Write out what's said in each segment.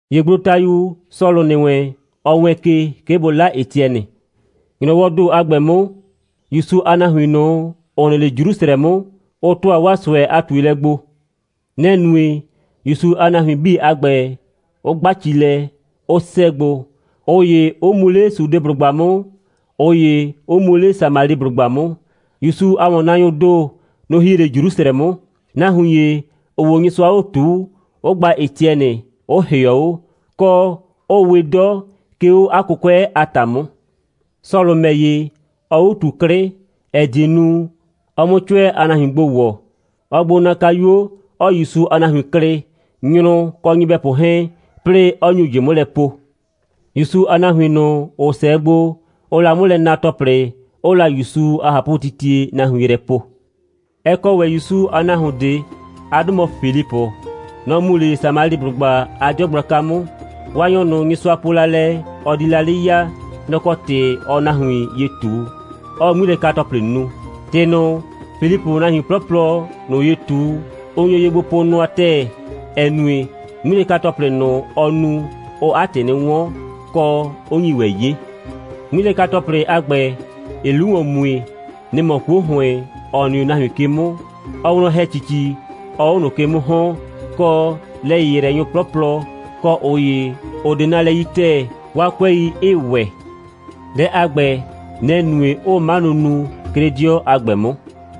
‑Ye gblotayu Sɔlʋ ‑nɩ wɛn, ɔ wɛɛn ke, 'ke bʋ 'la Etiɛnɩ. ‑Nyrɔwɔɔ ‑do a ‑gbɛ 'mʋ, ‑Yusu a nahuin ꞊nʋ, ‑ʋ nɩ 'le Jrusrɛdɩɔ 'mʋ, ʋ ‑tʋa 'waa ꞊sʋɛ a ꞊tuelɛ gbo. Nɛ‑ nue, ‑Yusu a nahuin 'bii a ‑gbɛ 'ʋ 'gba ci lɛ, 'ʋ 'sɛɛ gbo, ꞊ʋ ‑ye 'ʋ mu 'le Sudeblʋgba 'mʋ, ꞊ʋ ‑ye 'ʋ mu 'le Samaliblʋgba 'mʋ. ‑Yusu a ‑wɔnnaanyʋʋ ‑do, nʋ‑ hie 'le Jrusrɛ 'mʋ, nahuin ‑ye, ‑ʋʋ 'o Nyɩsʋa 'o ꞊tuu, ʋ gba Etiɛnɩ, 'ʋ ‑hɩɔ 'o, kɔ 'ʋʋ we 'dɔ, 'ke 'o 'a 'kʋkʋɛ a ‑ta 'mʋ. Sɔlʋ ‑mɛ ‑ye, ɔɔ 'o ꞊tu 'klɩ, ‑ɛ die nu, ɔ 'mʋ 'cʋɛ a nahuin gbo ‑wɔ. Ɔɔ gbo na kayuo, 'ɔɔ ‑Yusu a nahuin klɩ, nyrʋ kɔ nyɩbɛpʋ 'hɛɛn, 'plɩɩ 'ɔ nyu ꞊jɩ 'mʋ lɛ po. ‑Yusu a nahuin ꞊nʋ, ‑ʋ 'sɛɛ gbo, ʋʋ la 'mʋ lɛ na ‑tɔplɩ, 'ʋʋ la ‑Yusu a ꞊hapʋtitie nahuin yrɛ po. Ɛ kɔ ‑wɛ ‑Yusu a nahuon ꞊de. 'A 'dʋ mɔ Filipʋ. Nɔ‑ mu 'le Samaliblʋgba a 'dɩɔ gblaka 'mʋ. Waanyɔ ꞊nʋ, Nyɩsʋa po la lɛ, ɔ di la 'le ya, nɔ‑ kɔ ‑tɩ ɔɔ nahuin ye ꞊tu, 'ɔɔ 'ŋmilɛka‑tɔplɩ nu. ‑Tɩ ꞊nʋ, Filipʋʋ nahuin 'plɔplɔ ꞊nʋ ye ꞊tu, ʋ nyo ye gbo po nʋa ‑tɛɛ, ‑ɛ nue, 'ŋmilɛka‑tɔplɩ ꞊nʋ, ɔɔ nu, ʋʋ 'a ‑tɩ 'nɩ 'wɔn, kɔ, 'ʋ nyi ‑wɛ 'ye. 'Ŋmilɛka‑tɔplɩ a ‑gbɛ, ‑ɩɩ 'lu ‑wɔn mue, nɩ‑ mɔ 'kuo ‑hʋɩn, ‑ɔ nɩ 'o nahuin ke 'mʋ, ɔɔ wlɔn ‑hɛ ‑cici, 'ɔɔ 'o ꞊nʋ ke 'mʋ ‑hɔn, kɔ, lɛ‑yɩyrɛnyʋ 'plɔplɔ, kɔ ꞊ʋ ‑ye, ‑ʋ 'de nalɛ yi ‑tɛɛ, 'waa 'kʋɛi 'ɩɩ ‑wɛ. Dɛ a ‑gbɛ, nɛ‑ nue, 'ʋʋ 'manʋ nu, 'ke 'le 'dɩɔ a ‑gbɛ 'mʋ.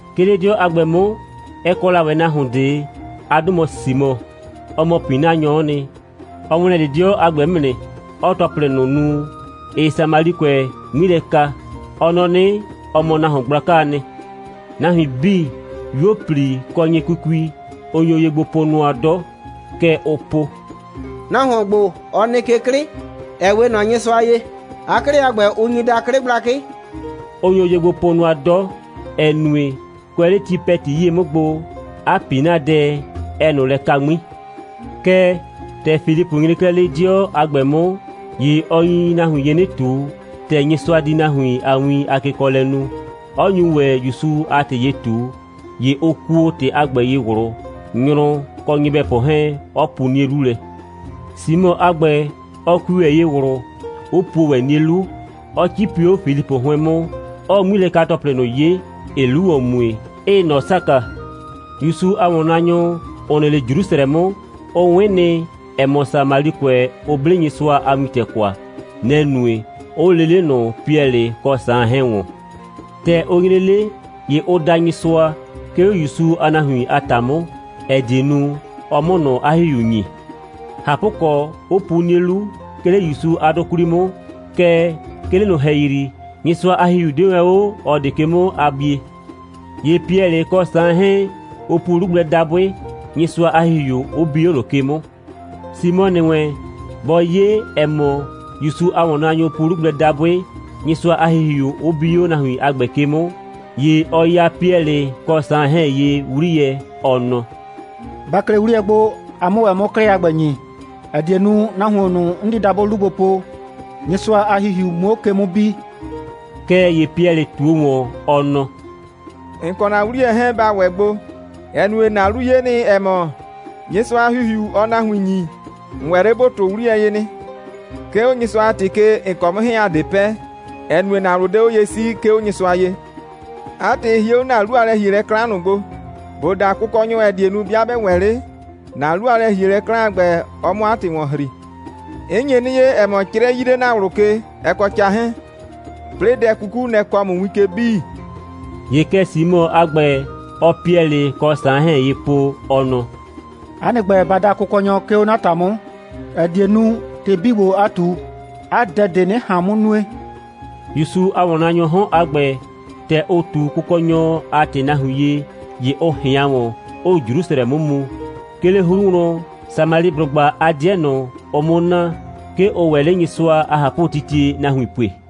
'Ke 'le 'dɩɔ a ‑gbɛ 'mʋ, ɛ kɔ la ‑wɛ nahuon ꞊de. 'A 'dʋ mɔ Simɔ. Ɔ mɔ ‑pinanyɔ'ɔ nɩ. Ɔ ‑wlɛn 'le 'dɩɔ a ‑gbɛ 'mʋ nɩ, 'ɔɔ ‑tɔplɩ ꞊nʋ nu, ‑ɩɩ Samalikʋɛ 'ŋmi lɛ ka. Ɔ nɔ 'nɩ, ɔ mɔ nahuon gblakaa nɩ. Nahuin 'bii, 'yuo꞊pli kɔ nyɩkukui, ʋ nyo ye gbo po nʋa 'dɔ. Kɛ ʋʋ po: «Nahuon ‑gbo, ɔ nɩ ke 'klɩ, ‑ɛ 'we ꞊nɔ Nyɩsʋa ye. 'A 'klɩ a ‑gbɛ, ʋ nyi daa 'klɩ gblakɩ.» Ʋ nyo ye gbo po nʋa 'dɔ, ‑ɛ nue, kʋɛ 'le ti ‑pɛti 'yie 'mʋ gbo, 'a ‑pinadɛ, ɛɛ ꞊nʋ lɛ ka 'ŋmi. Kɛɛ, ‑tɛ Filipʋ nyre 'klɛɛ 'le 'dɩɔ a ‑gbɛ 'mʋ, ‑ye ɔ nyi nahuin ye 'nɩ ꞊tu, ‑tɛ Nyɩsʋa di nahuin a win kekɔɔlɛ nu, 'ɔ nyu ‑wɛ ‑Yusu a ‑tɩ ye ꞊tu, ‑ye ʋ kuo ‑tɩ a ‑gbɛ ye ꞊wlʋ, nyrʋ kɔ nyɩbɛpʋ 'hɛɛn, 'ɔ pu 'nie 'lu lɛ. Simɔ a ‑gbɛ, ɔ kui ‑wɛ ye ꞊wlʋ, 'ʋ puo ‑wɛ 'nie 'lu, 'ɔ 'cipi 'o Filipʋ 'hʋɩn 'mʋ, 'ɔɔ 'ŋmilɛka‑tɔplɩ ꞊nʋ 'ye, ‑ɩɩ 'lu ‑wɔn mue, 'ɩɩ ꞊nɔ saka. ‑Yusu a ‑wɔnnaanyʋ, ‑ʋ nɩ 'le Jrusrɛ 'mʋ, ʋ 'wɩn nɩ, ‑ɛ mɔ, Samalikʋɛ, ʋ 'ble Nyɩsʋa a wintɛ kwa. Nɛ‑ nue, 'ʋ lee 'le ꞊nʋ Piɛlɩ kɔ Saan 'hɛɛn ‑wɔn. ‑Tɛ ʋ nyre 'le, ‑ye ʋ da Nyɩsʋa, 'ke 'o ‑Yusu a nahuin a ‑ta 'mʋ, ‑ɛ die nu, ɔ 'mʋ ꞊nʋ 'a ‑Hihiu ‑nyi. ꞊Hapʋkɔ, 'ʋ pu 'nie 'lu, 'ke 'le ‑Yusu a 'dʋ 'kwli 'mʋ, kɛɛ, 'ke 'le ꞊nʋ ‑hɛyri, Nyɩsʋa a ‑Hihiu 'de wɛn 'o ꞊ɔ ꞊de ke 'mʋ a bie. ‑Ye Piɛlɩ kɔ Saan 'hɛɛn, ʋ pu 'lu gblɛ dabʋɩ, Nyɩsʋa a ‑Hihiu 'ʋ bi 'o ꞊nʋ ke 'mʋ. Simɔ ‑nɩ wɛn, bɔ 'ye, ‑ɛ mɔ, ‑Yusu a ‑wɔnnaanyʋ pu 'lu gblɛ dabʋɩ, Nyɩsʋa a ‑Hihiu 'ʋ bi 'o nahuin a ‑gbɛ ke 'mʋ, ‑ye ɔ ya Piɛlɩ kɔ Saan 'hɛɛn ye 'wliyɛ, ɔ nɔ: «Ba klɩ 'wliyɛ gbo, a 'mʋ ‑wɛ 'mʋ 'klɩ a ‑gbɛ ‑nyi, ‑ɛ die nu, nahuon ꞊nʋ, 'n di dabʋɩ 'lu gbo po, Nyɩsʋa a ‑Hihiu 'muo 'o ke 'mʋ bi.» Kɛɛ ‑ye Piɛlɩ ꞊tuo ‑wɔn, ɔ nɔ: «‑N kɔ ‑na 'wliyɛ 'hɛɛn, ba ‑wɛ gbo, ‑ɛ nue, ‑na 'lu 'ye nɩ, ‑ɛ mɔ, Nyɩsʋa a ‑Hihiu, ɔɔ nahuin ‑nyi, ‑n ‑wɛ 'le ‑bo ‑tʋʋ 'wliyɛ ye nɩ. 'Ke 'o Nyɩsʋa a ‑tɩ ke, ‑n kɔ ‑a mʋ 'hɛɛn, ‑a 'de pɛ, ‑ɛ nue, ‑na ꞊wlʋ 'de 'o ye 'sii, 'ke 'o Nyɩsʋa ye. 'A ‑tɩ, hie 'o ‑na 'lu a lɛ‑hielɛ 'klan ꞊nʋ gbo, ‑bo da Kʋkɔnyɔ, ‑ɛ die nu, 'bɩa 'bɛ ‑wɛ 'le, ‑na 'lu a lɛ‑hielɛ 'klan a ‑gbɛ, ɔ 'mʋ 'a ‑tɩ ‑wɔn ‑hri. 'N nye 'nɩ 'ye, ‑ɛ mɔ, 'crɛ 'yii 'le ‑na ꞊wlʋ ke, ɛ kɔ ca 'hɛɛn, 'plɩɩ dɛ 'kuku, nɛ‑ kɔɔ ‑mʋ win ke 'bii.» ‑Ye kɛ Simɔ a ‑gbɛ, ɔɔ Piɛlɩ kɔ Saan 'hɛɛn ye po, ɔ nɔ: «'A nɩ ‑gbɛ, ba da Kʋkɔnyɔ, 'ke 'o 'na ‑ta 'mʋ, ‑ɛ die nu, ‑tɩ 'bii ‑gbo, a ꞊tu, 'a dɛ ꞊de 'nɩ ꞊han 'mʋ nue.» ‑Yusu a ‑wɔnnaanyʋʋ 'hɔn a ‑gbɛ, ‑tɛ ʋ ꞊tu Kʋkɔnyɔ a ‑tɩ nahuin ye, ‑ye ʋ ꞊hɩan ‑wɔn, 'ʋʋ Jrusrɛ 'mʋ mu. 'Ke 'le 'hru wlɔn, Samaliblʋgba a 'dɩɛ ꞊nʋ, ʋʋ 'mʋ na, 'ke ʋʋ ‑wɛ 'le Nyɩsʋa a ꞊hapʋtitie nahuin pue.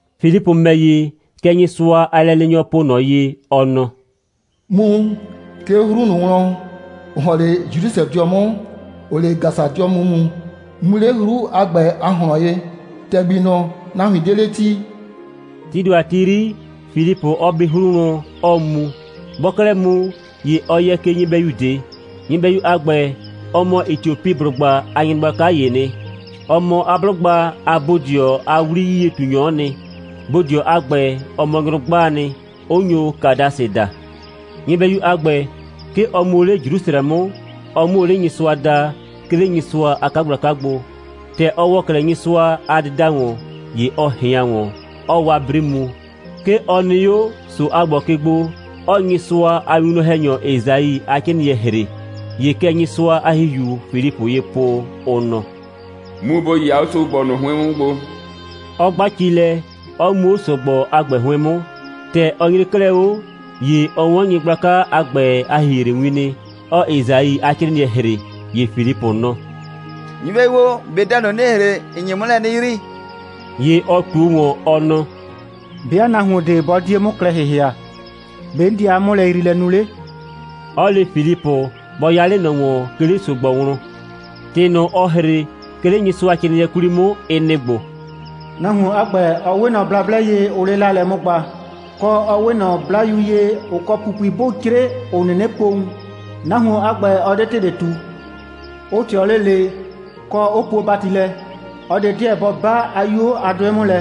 Filipʋ ‑mɛ ‑ye, kɛ Nyɩsʋa a lɛleenyɔ po ꞊nɔ ye, ɔ nɔ: «Mu, 'ke 'o 'hru ꞊nʋ wlɔn, ‑ʋ ‑hɔn 'le Jrusrɛdɩɔ 'mʋ, ‑ʋʋ 'le Gasadɩɔ 'mʋ mu. Mu 'le 'hru a ‑gbɛ a ꞊hlɔn ye, ‑tɛgbi ꞊nʋ, nahuin 'de 'le 'ti.» Tii ‑do a ti 'yri, Filipʋ ɔ bi wlɔn 'hru, 'ɔɔ mu. Bɔɔ 'klɛɛ mu, ‑ye ɔ yɛ ke nyɩbɛyu ꞊de. Nyɩbɛyu a ‑gbɛ, ɔ mɔ Etiopiblʋgba a nyɩgblaka ‑yee nɩ. Ɔ mɔ 'a 'blʋgba a bodɩɔ a 'wli'yie꞊tunyɔ'ɔ nɩ. Bodɩɔ a ‑gbɛ, ɔ mɔ nyrʋgbaa nɩ, 'ʋ nyo Kadasɩ daa. Nyɩbɛyu a ‑gbɛ, 'ke ɔ mu o 'le Jrusrɛ 'mʋ, ɔ 'mʋ o 'le Nyɩsʋa daa, 'ke 'le Nyɩsʋa a 'kagblaka gbo. ‑Tɛ ɔ ‑wɔ 'klɛɛ Nyɩsʋa a dɩda ‑wɔn, ‑ye ɔ ꞊hɩan ‑wɔn, 'ɔɔ 'waa 'bri mu. 'Ke ɔ nɩ 'o ‑so a ‑gbɔ ke gbo, 'ɔɔ Nyɩsʋa a winwlɔn‑hɛnyɔ Esai a 'crɩɩnɩɛ ‑hre. ‑Ye kɛ Nyɩsʋa a ‑Hihiuu Filipʋ ye po, ʋ nɔ: «Mu, ‑bo 'yɩya 'o ‑so‑gbɔ ꞊nʋ 'hʋɩn 'mʋ gbo,» 'ɔ gba cigbɛi, 'ɔ mu 'o ‑so‑gbɔ a ‑gbɛ 'hʋɩn 'mʋ. ‑Tɛ ɔ nyre 'klɛɛ 'o, ‑ye ɔ 'wɔn nyɩgblaka a ‑gbɛ a ‑hihrewin nɩ, 'ɔɔ Esai a 'crɩɩnɩɛ ‑hre. ‑Ye Filipʋ nɔ: «Nyɩbɛyu o, ꞊be dɛ ꞊nʋ, ‑nɩɩ ‑hre, ‑n nye 'mʋ lɛ 'nɩ yrii?» ‑Ye ɔ ꞊tuo ‑wɔn, ɔ nɔ: «'Bɩa nahuon ꞊de 'bɔ 'die 'mʋ klɛ ‑hɩhɩa, ‑be' 'n di 'a 'mʋlɛyriilɛ nu 'le?» 'ɔ le Filipʋ, bɔ 'ya 'le ꞊nɔ ‑wɔn, 'ke 'le ‑so‑gbɔ wlɔn. ‑Tɩ ꞊nʋ, ɔɔ ‑hre, 'ke 'le Nyɩsʋacrɩɩnɩɛ 'kwli 'mʋ, ɩ nɩ‑ ‑gbo: «Nahuon a ‑gbɛ, ɔ 'we ꞊nɔ blablɛ ye, ʋʋ 'le 'laalɛ 'mʋ gba, kɔ, ɔ 'we ‑wɛ ꞊nɔ 'blayu ye, ‑ʋ kɔ ‑pupui 'bʋʋ 'cre, ‑ʋ 'nɩnɩ po wun. Nahuon a ‑gbɛ, ɔ 'de ‑tɩ ꞊de ꞊tu. Ʋ ꞊tɩɔ 'le ꞊le, kɔ, 'ʋ puo hɩ‑bati lɛ. ꞊Ɔ ꞊de 'deɛ bɔ 'ba 'a 'yuo a 'dʋɩ ye 'mʋ lɛ,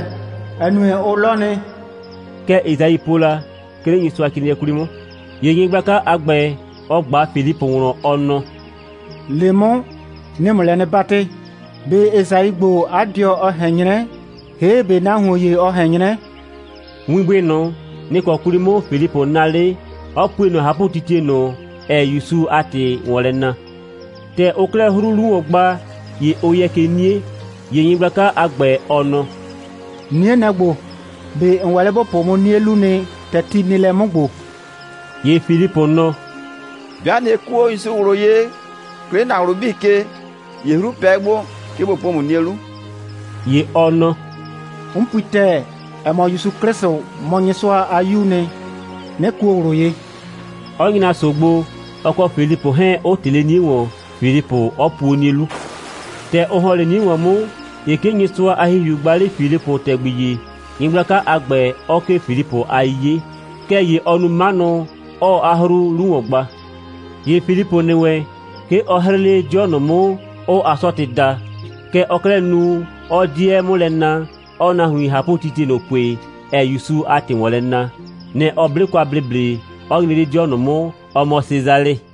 ‑ɛ nue, ʋ 'lɔ nɩ. Kɛ Esai po la, 'ke 'le Nyɩsʋacrɩɩnɩɛ 'kwli 'mʋ.» ‑Ye nyɩgblaka a ‑gbɛ, ɔ ꞊gba Filipʋ wlɔn, ɔ nɔ: «Le 'mʋ, 'nɩɩ ‑mʋ lɛ 'nɩ 'batɩ: ꞊Be Esai ‑gbo, 'a dɩɔ ɔ ꞊hɛn 'nyrɛ, ‑hee', ꞊be nahuon ‑ye ɔ ꞊hɛn 'nyrɛ?» Winbʋɩ ꞊nʋ, nɩ‑ kɔ 'kwli 'mʋ Filipʋ naa 'le, 'ɔ pue ꞊nɔ ꞊hapʋtitie ꞊nʋ, ‑ɛɛ ‑Yusu a ‑tɩ ‑wɔn lɛ na. ‑Tɛ ʋʋ 'klɛɛ 'hru 'lu ‑wɔn gba, ‑ye ʋ yɛ ke 'nie. ‑Ye nyɩgblaka a ‑gbɛ, ɔ nɔ: «'Nie, nɛ‑ ‑gbo. ꞊Be ‑n ‑wɛ 'le ‑bo po 'mʋ 'nie 'lu nɩ, ‑tɛ ti nɩ lɛ 'mʋ ‑gbo?» [ ‑Ye Filipʋ nɔ: «'Bɩa ꞊nɩ kuo ‑Yusu ꞊wlʋ ye, 'ke 'le ‑na ꞊wlʋ 'bii ke, ‑ye 'hru pɛ 'o gbo, 'ke ꞊bo po ‑mʋ 'nie 'lu.» ‑Ye ɔ nɔ: «'N pui ‑tɛɛ, ‑ɛ mɔ, ‑Yusu 'Klɩsʋ mɔ Nyɩsʋa a 'Yuu nɩ, 'nɩ kuo ꞊wlʋ ye,»] 'ɔ nyra ‑so gbo, ɔ kɔ Filipʋ 'hɛɛn, 'ʋ ꞊tɩ 'le 'nie ‑wɔn, Filipʋ 'ɔ puo 'nie 'lu. ‑Tɛ ʋ ‑hɔn 'le 'nie ‑wɔn 'mʋ, ‑ye 'ke Nyɩsʋa a ‑Hihiu gba 'le Filipʋ ‑tɛgbi ‑ye, nyɩgblaka a ‑gbɛ 'ɔ 'kee Filipʋ a 'yiye. Kɛɛ ‑ye ɔɔ nu 'manʋ, 'ɔɔ 'a 'hru 'lu ‑wɔn gba. ‑Ye Filipʋ ‑nɩ wɛn, 'ke ɔ 'hrɩɩ 'le 'dɩɔ ꞊nʋ 'mʋ, ʋʋ Asɔtɩ daa. Kɛ ɔɔ 'klɛɛ nu, 'ɔɔ 'dɩɛ 'mʋ lɛ na, 'ɔɔ nahuin ꞊hapʋtitie ꞊nʋ pue, ‑ɛɛ ‑Yusu a ‑tɩ ‑wɔn lɛ na. Nɛ‑ ɔ 'ble kwa ‑bleble, 'ɔ nyre 'le 'dɩɔ ꞊nʋ 'mʋ, ‑ɔ mɔ Sesalɩ.